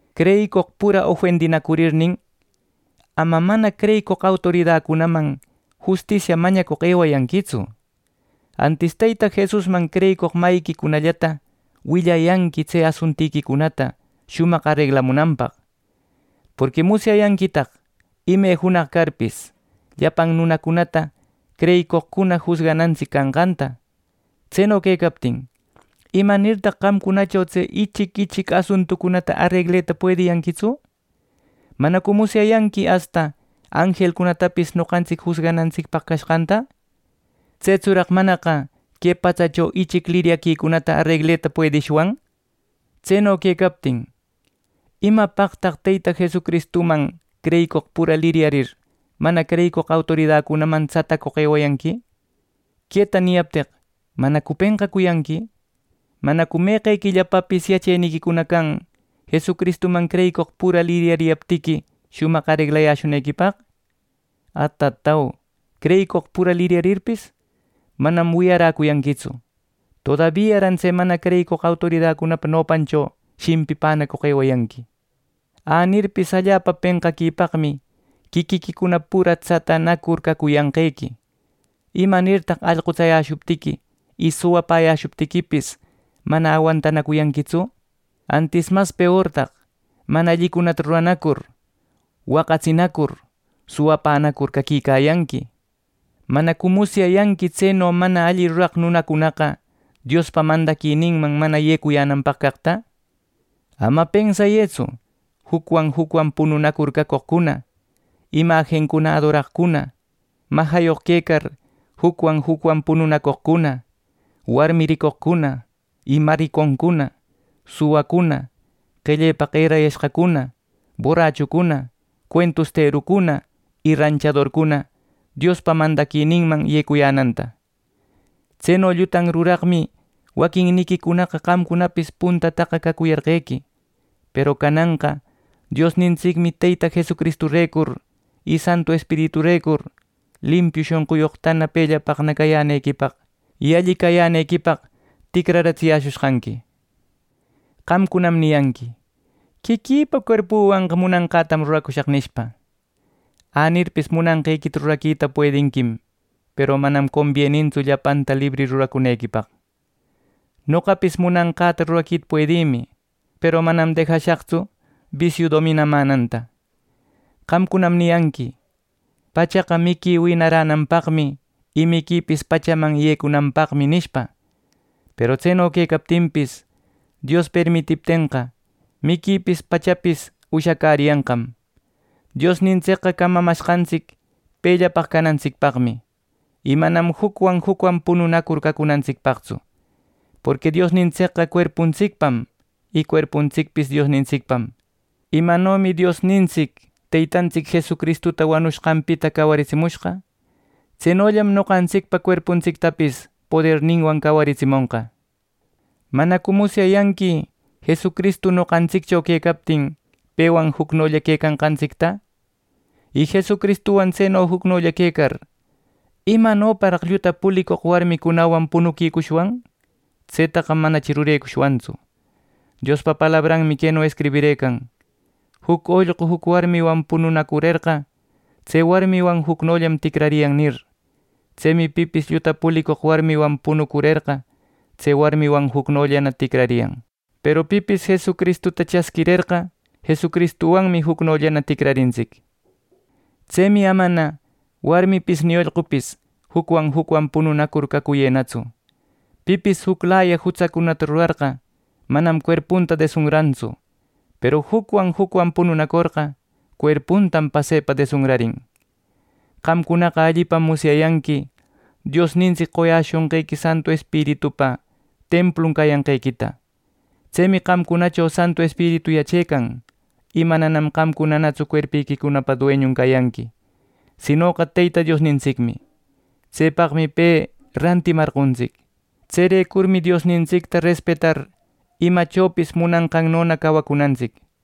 Creyicoq pura ofendinacurirnin, ama mana creyicoq autoridacunaman justisia mañacoq ewayanquitsu. Antis Teyta Jesusman creyicoq mayiquicunallata willayanqui tse asuntiquicunata shumaq areglamunanpaq. Porqui musyayanquitaq ime junaq carpis, llapan nunacunata creyicoqcuna jusganantsic canqanta. Tseno quecaptin, ¿imanirtaq qamcunacho tse ichic ichic asuntucunata aregleta puediyanquitsu! ¿Manacu musyayanqui asta anjelcunatapis noqantsic jusganantsicpaq cashqanta! ¡Tsetsuraq manaqa que patsacho ichic liryaquicunata aregleta puedishwan! Tseno quecaptin, ¿imapaqtaq Teyta Jesucristuman creyicoq pura liryarir, mana creyicoq autoridacunaman tsatacoq ewayanqui! Queta niyapteq ¿manacu penqacuyanqui! ¿Manacu meqequillapapis yacheniquicuna can Jesucristuman creyicoq pura liryariyaptiqui, shumaq areglayäshunequipaq! ¡Atatau creyicoq pura liryarirpis manam wiyaräcuyanquitsu! Todabiaran tse mana creyicoq autoridacunapa nopancho shimpipänacoq ewecayanqui. Änirpis allapa penqaquipaqmi quiquiquicuna pura tsatanacur cacuyanqequi. ¿Imanirtaq allqutsayäshuptiqui y suwapäyäshuptiquipis mana awantaquicuyanquitsu! Antis mas peortaq mana allicunata ruranacur, waqatsinacur, suwapänacur caquicayanqui. ¿Manacu musyayanqui tseno mana alli ruraq nunacunaqa Diospa mandaquininman mana yecuyänanpaq caqta! Ama pensayëtsu jucwan jucwan pununacur cacoqcuna, imajincuna adoracoqcuna, majayoq quecar jucwan jucwan pununacoqcuna, warmi ricoqcuna y mariconcuna, suwacuna, qellepaq erayashqacuna, borrachucuna, cuentusterucuna y ranchadorcuna, Diospa mandaquininman yecuyänanta. Tseno llutan ruraqmi waquinniquicunaqa qamcunapis puntataqa cacuyarqequi, peru cananqa Diosnintsicmi Teyta Jesucristurecur y Santu Espiriturecur, limpiu shonquyoqtana, pellapaqna cayänequipaq, y alli cayänequipaq ticrararatsiyäshushqanqui. Qamcunam niyanqui: “Quiquïpa cuerpüwanqa munanqätam ruracushaq” nishpa. Änirpis munanqequita ruraquita puedinquim, peru manam combienintsu llapanta libri ruracunequipaq. Noqapis munanqäta ruraquita puedïmi, peru manam dejashaqtsu bisiu dominamänanta. Qamcunam niyanqui: “Pachaqa miqui winaränanpaqmi, y miquipis pachaman yecunanpaqmi” nishpa, peru tseno quecaptinpis Dios permitiptenqa, miquipis pachapis ushacäriyanqam. Diosnintsicqa camamashqantsic pellapaq canantsicpaqmi, y manam jucwan jucwan pununacur cacunantsicpaqtsu. Porqui Diosnintsicqa cuerpuntsicpam y cuerpuntsicpis Diosnintsicpam. Imanomi Diosnintsic Teytantsic Jesucristuta wanushqanpita cawaritsimushqa, tsenollam noqantsicpa cuerpuntsictapis poderninwan cawaritsimonqa. ¿Manacu musyayanqui Jesucristu noqantsiccho quecaptin pewan jucnolla quecanqantsicta! Y Jesucristuwan tseno jucnolla quecar ¿imanoparaq lluta pulicoq warmicunawan punuquicushwan! Tsetaqa manachi rurecushwantsu. Diospa palabranmi queno escribirëcan: “Juc ollqu juc warmiwan pununacurerqa, tse warmiwan jucnollanam ticrariyan” nir. Tsemi pipis lluta pulicoq warmiwan pununacurerqa tse warmiwan jucnollana ticrariyan. Peru pipis Jesucristuta chasquirerqa, Jesucristuwanmi jucnollana ticrarintsic. Tsemi amana warmipis ni ollqupis jucwan jucwan pununacur cacuyënatsu. Pipis juclaya jutsacunata rurarqa manam cuerpunta desunrantsu, peru jucwan jucwan pununacorqa, cuerpuntam pasepa desunrarin. Qamcunaqa allipam musyayanqui Diosnintsic qoyäshonqequi Santu Espiritupa templun cayanqequita. Tsemi qamcunacho Santu Espiritu yachecan y mananam qamcunanatsu cuerpiquicunapa dueñun cayanqui, sinoqa Teyta Diosnintsicmi. Tsepaqmi pe rantimarqontsic. Tserecurmi Diosnintsicta respetar, imachopis munanqannona cawacunantsic.